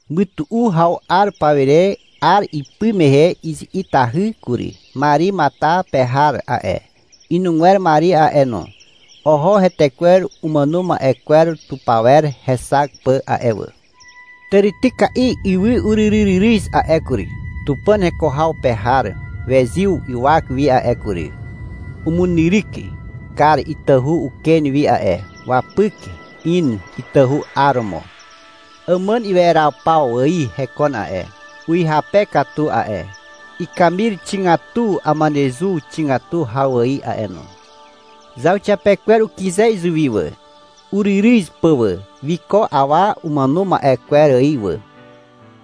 Mytu'u haw 'ar pawire 'ar ipy mehe izi'itahy kury. Mari Matar pe har a'e, inugwer Mari a'e no, oho hetekwer umàno ma'e kwer tupawer hexak pà a'e wà. Tàrityka'i ywy uryryryryz a'e kury. Tupàn heko haw pe har wezyw ywak wi a'e kury. Umunyryk kar itahu uken wi a'e. Wapyk in itahu 'aromo. Àmàn iweraw paw ài hekon a'e, uhyape katu a'e. Ikamir xigatu amanezu xigatu haw ài a'e no. Zauxiapekwer ukyze izuwi wà, uryryz pà wà. Wiko awa umàno ma'e kwer ài wà.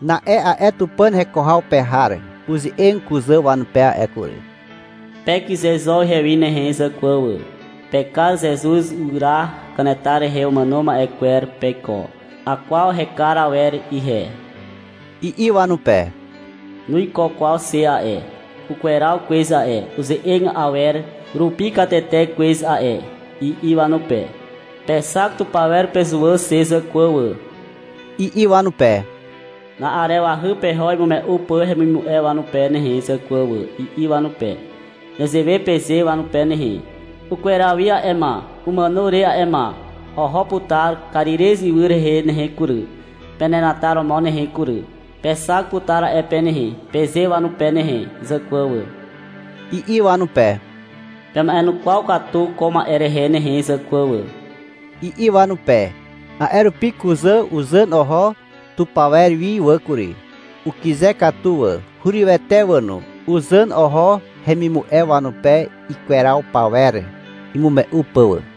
Na'e a'e Tupàn heko haw pe har uze'eg kuzà wanupe a'e kury. — Pekyze zo ihewi nehe, zàkwà wà. Pekar Zezuz ywyra kanetar rehe umàno ma'e kwer peiko. Akwaw hekar awer ihe, i'i wanupe. — Nuiko kwaw xe a'e. Ukweraw kwez a'e, uze'eg awer rupi katete kwez a'e, i'i wanupe. — Pexak tupawer pezuwà xe, zàkwà wà, i'i wanupe. — Na'arewahy peho imume'u pà hemimu'e wanupe nehe zàkwà wà, i'i wanupe. — Nezewe peze wanupe nehe. — Ukweraw wi a'e ma, umàno re a'e ma. Oho putar Karirez ywy rehe nehe kury, penenataromo nehe kury. Pexak putar a'e pe nehe, peze wanupe nehe zàkwà wà, i'i wanupe. — Pema'enukwaw katu ko ma'e rehe nehe zàkwà wà, i'i wanupe. A'e rupi kuzà uzàn oho tupawer wi wà kury. Ukyze katu wà. Hurywete wà no. Uzàn oho hemimu'e wanupe ikweraw pawer imume'u pà wà.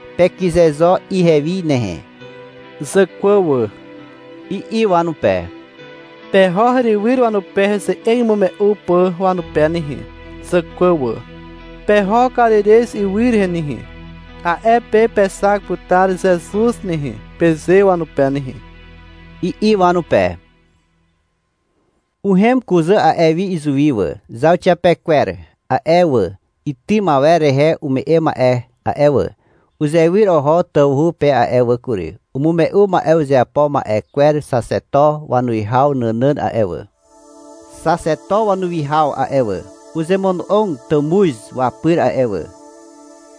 — Pekyze zo ihewi nehe, zàkwà wà, i'i wanupe. — Peho herywyr wanupe heze'eg imume'u pà wanupe nehe, zàkwà wà. — Peho Karirez ywy rehe nehe. A'e pe pexak putar Zezuz nehe, peze wanupe nehe, i'i wanupe. Uhem kuzà a'e wi izuwi wà. Zauxiapekwer a'e wà, itym awer rehe ume'e ma'e a'e wà, uzewyr oho tawhu pe a'e wà kury. Umume'u ma'e uzeapo ma'e kwer xaxeto wanuwihaw nànàn a'e wà. Xaxeto wanuwihaw a'e wà, uzemono'og tàmuz wapyr a'e wà.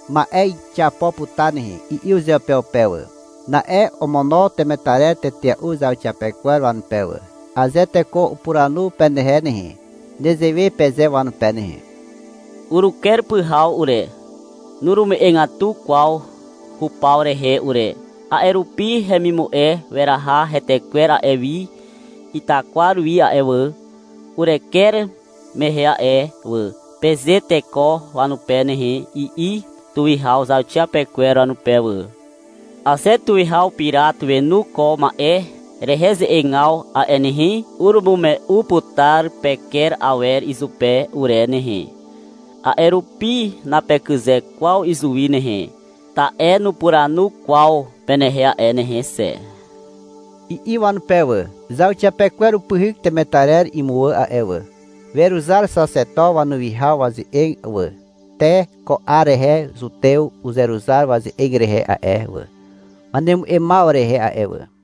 — Ma'e xiapo putar nehe, i'i uzeupeupe wà. Na'e omono temetarer tetea'u zauxiapekwer wanupe wà. — Aze teko upuranu penehe nehe, nezewe peze wanupe nehe. — Uruker pyhaw ure. Nurume'egatu kwaw hupaw rehe ure, a'e rupi hemimu'e weraha hetekwer a'e wi itakwar wi a'e wà, ureker mehe a'e wà, peze teko wanupe nehe, i'i tuwihaw zauxiapekwer wanupe wà. — Aze tuwihaw Pirat wenu ko ma'e rehe ze'egaw a'e nehe, urumume'u putar peker awer izupe ure nehe. A'e rupi napekyze kwaw izuwi nehe, ta'e nupuranu kwaw penehe a'e nehe xe, i'i wanupe wà. Zauxiapekwer upyhyk temetarer imuwà a'e wà. Weruzar xaxeto wanuwihaw waze'eg wà. Te ko 'ar rehe Zutew uzeruzar waze'eg rehe a'e wà, wanemu'emaw rehe a'e wà.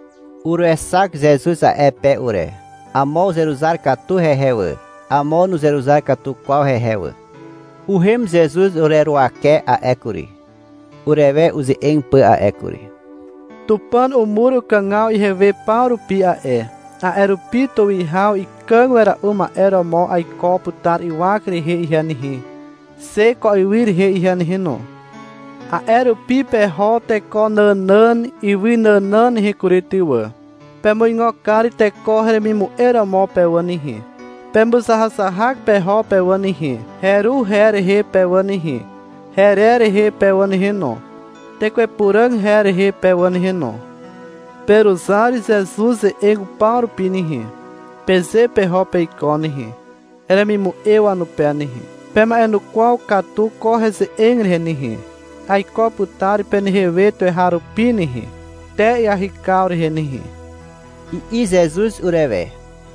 Uruexak Zezuz a'e pe ure. Amo uzeruzar katu hehe wà. Amo nuzeruzar katu kwaw hehe wà. Uhem Zezuz ureruwake a'e kury, urewe uze'eg pà a'e kury. — Tupàn umur ukàgaw ihewe paw rupi a'e, a'e rupi tuwihaw ikàg wera'u ma'e romo aiko putar ywak rehe ihe nehe, xe ko ywy rehe ihe nehe no. A'e rupi peho teko nànàn ywy nànàn nehe kury ty wà. Pemuigo kar teko heremimu'e romo pe wà nehe. Pemuzahazahak peho pe wà nehe, heru her rehe pe wà nehe, herer rehe pe wà nehe no, tekwe Puràg her rehe pe wà nehe no. — Peruzar Zezuz ze'eg upaw rupi nehe, peze peho peiko nehe, heremimu'e wanupe nehe. Pema'enukwaw katu ko heze'eg rehe nehe. Aiko putar penehe we tuweharupi nehe, te iahykaw rehe nehe, i'i Zezuz urewe.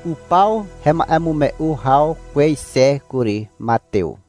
Upaw hema'emume'u haw kwez xe kury. Matew.